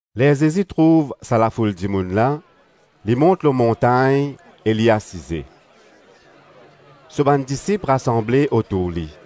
Ler Zezi trouv sa lafoul dimoun la, li mont lor montagn e li asize. So bann disip rasanble otour li.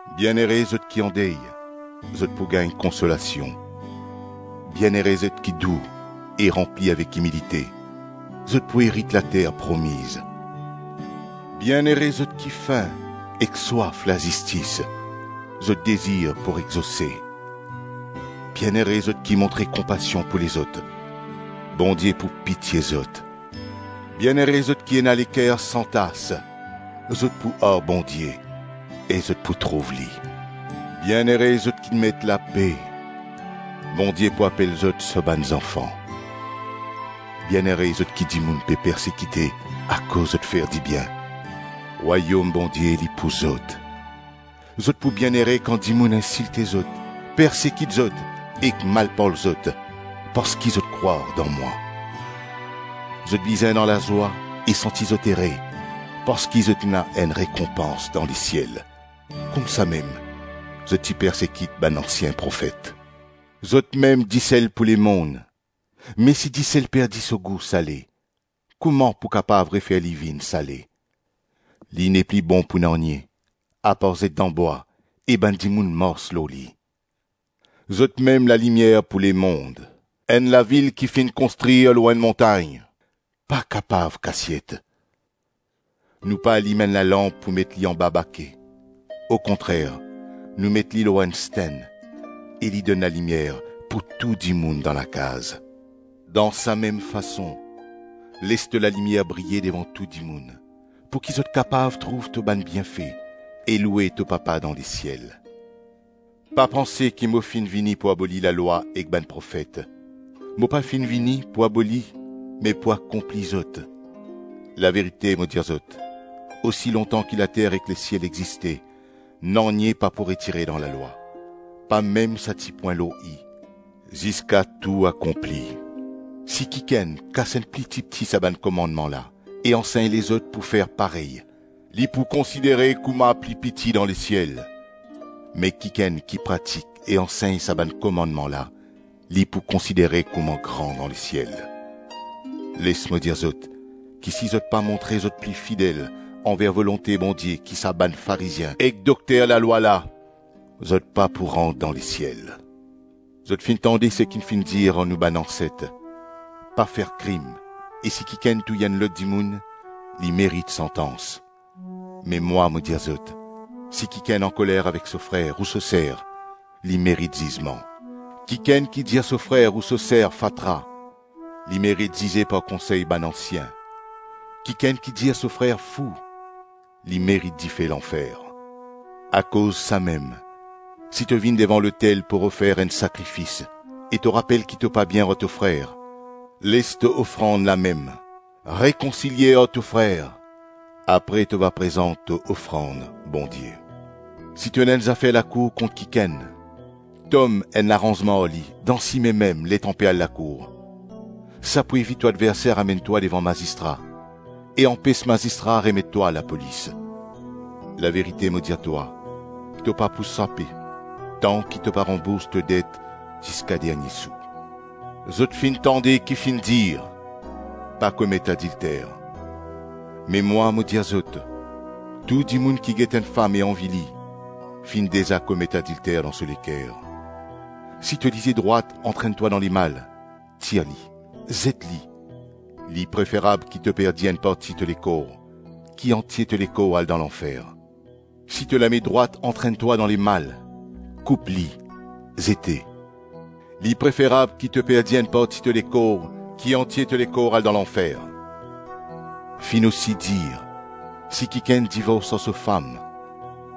Bienere zot ki andey, zot pou gagn konsolasion. Bienere zot ki dou e ranpli avek imilite, zot pou erit later promiz. Bienere zot ki fin ek swaf lazistis, zot dezir pou exose. Bienere zot ki montre konpasion pou lezot, Bondie pou pitie zot. Bienere zot ki ena leker san tas, zot pou ar Bondie e zot pou trouv li. Bienere zot ki met lape, Bondie pou apel zot so bann zanfan. Bienere zot ki dimoun pe persekite akoz zot fer dibien, Rwayom Bondie li pou zot. Zot pou Bienere kan dimoun insilte zot, persekit zot ek malparl zot parski zot krwar dan mwa. Zot bizin dan lazwa e santi zot ere parski zot ena enn rekonpans dan lesiel; koumsamem zot ti persekit bann ansien profet. Zotmem disel pou lemonn. Me si disel perdi so gou sale, kouma pou kapav refer li vinn sale? Li nepli bon pou nanye, apar zet dan bwa e bann dimoun mars lor li. Zotmem lalimier pou lemonn. Enn lavil ki finn konstrir lor enn montagn pa kapav kasiet. Nou pa alim enn lalanp pou met li anba bake. Okontrer nou met li lor enn stenn, e li donn lalimier pou tou dimoun dan lakaz. Dan samem fason, les to lalimier briye devan tou dimoun, pouki zot kapav trouv to bann bienfe e loue to Papa dan lesiel. Pa panse ki mo finn vini pou aboli lalwa ek bann profet; mo pa finn vini pou aboli me pou akonpli zot. Laverite mo dir zot, osi lontan ki later ek lesiel existe, nanye pa pou retire dan lalwa, pa mem sa ti pwin lor i, ziska tou akonpli. Si kikenn kas enn pli tipti sa bann komannman la e ansegn lezot pou fer parey, li pou konsidere kouma pli piti dan lesiel, me kikenn ki pratik e ansegn sa bann komannman la li pou konsidere kouma gran dan lesiel. Les mo dir zot ki si zot pa montre zot pli fidel anver volonte Bondie ki sa bann Farizien ek dokter lalwa la, zot pa pou rant dan lesiel. Zot finn tande seki finn dir ar nou bann anset, ‘Pa fer krim e si kikenn touy enn lot dimoun, li merit santans.’ Me mwa mo dir zot, si kikenn ankoler avek so frer ou so ser, li merit zizman. Kikenn ki dir so frer ou so ser ‘fatra’, li merit zize par konsey bann ansien; kikenn ki dir so frer ‘fou’ li merit dife lanfer. Akoz samem si to vinn devan lotel pou ofer enn sakrifis e to rapel ki to pa bien ar to frer, les to ofrand lamem, rekonsilie ar to frer, apre to va prezant to ofrand Bondie. Si to ena enn zafer lakour kont kikenn, tom enn laranzman ar li dan sime mem letan pe al lakour. Sa pou evit to adverser amenn twa devan mazistra, e anpes mazistra remet twa lapolis. Laverite mo dir twa, to pa pou sape tanki to pa ranbours to det ziska dernie sou. Zot finn tande ki finn dir, ‘Pa komet adilter.’ Me mwa, mo dir zot, tou dimoun ki get enn fam e anvi li, finn deza komet adilter dan so leker. Si to lizie drwat antrenn twa dan lemal, tir li, zet li; li preferab ki to perdi enn parti to lekor, ki antie to lekor al dan lanfer. Si to lame drwat antrenn twa dan lemal, koup li, zete, li preferab ki to perdi enn parti to lekor ki antie to lekor al dan lanfer. Finn osi dir, ‘Si kikenn divors ar so fam,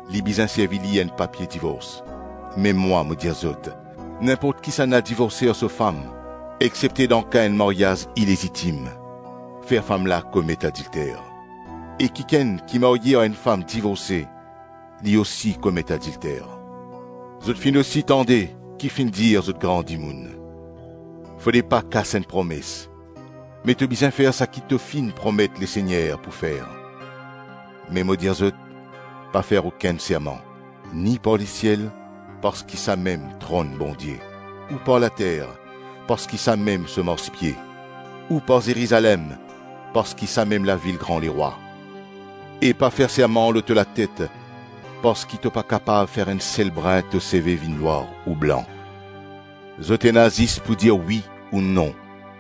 li bizin servi li enn papie divors.’ Me mwa, mo dir zot, ninport kisannla divorse ar so fam, exsepte dan ka enn maryaz ilezitim, fer fam la komet adilter, e kikenn ki marye ar enn fam divorse li osi komet adilter Zot finn osi tande ki finn dir zot gran dimoun, ‘Fode pa kas enn promes, me to bizin fer saki to finn promet Lesegner pou fer.’ Me mo dir zot, pa fer okenn serman, ni par lesiel parski samem tronn Bondie ou par later, parski samem so marspie, ou par Zerizalem parski samem lavil gran Lerwa, e pa fer serman lor to latet, parski to pa kapav fer enn sel brin to seve vinn nwar ou blan; zot ena zis pou dir wi ou non,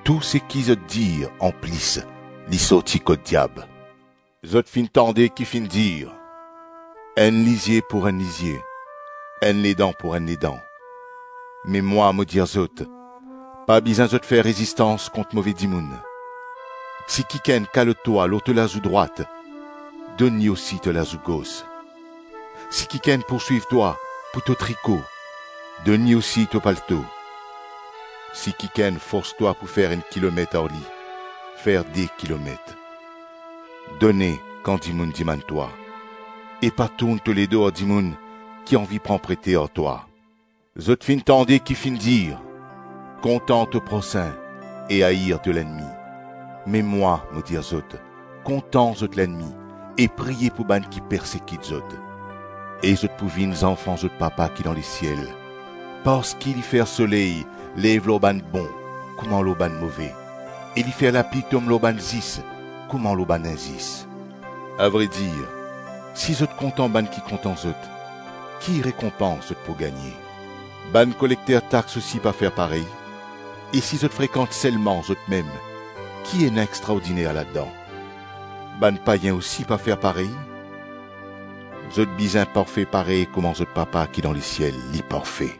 tou seki zot dir anplis li sorti kot diab. Zot finn tande ki finn dir, ‘Enn lizie pou enn lizie, enn ledan pou enn ledan.’ Me mwa, mo dir zot pa bizin zot fer rezistans kont move dimoun. Si kikenn kalot twa lor to lazou drwat, donn li osi to lazou gos. Si kikenn pourswiv twa pou to triko, donn li osi to palto. Si kikenn fors twa pou fer enn kilomet ar li, fer de kilomet. Done kan dimoun dimann twa, e pa tourn to ledo ar dimoun ki anvi pran prete ar twa. Zot finn tande ki finn dir, ‘Kontan to prosin e air to lennmi.’ Me mwa, mo dir zot: kontan zot lennmi e priye pou bann ki persekit zot. E zot pou vinn zanfan zot Papa ki dan lesiel, parski li fer so soley lev lor bann bon kouma lor bann move e li fer lapli tom lor bann zis kouma lor bann inzis. Avredir, si zot kontan bann ki kontan zot, ki rekonpans zot pou gagne. Bann kolekter tax osi pa fer parey? E si zot frekant selman zotmem, ki ena extraordiner ladan? Bann payin osi pa fer parey? Zot bizin parfe parey kouma zot Papa ki dan lesiel li parfe.”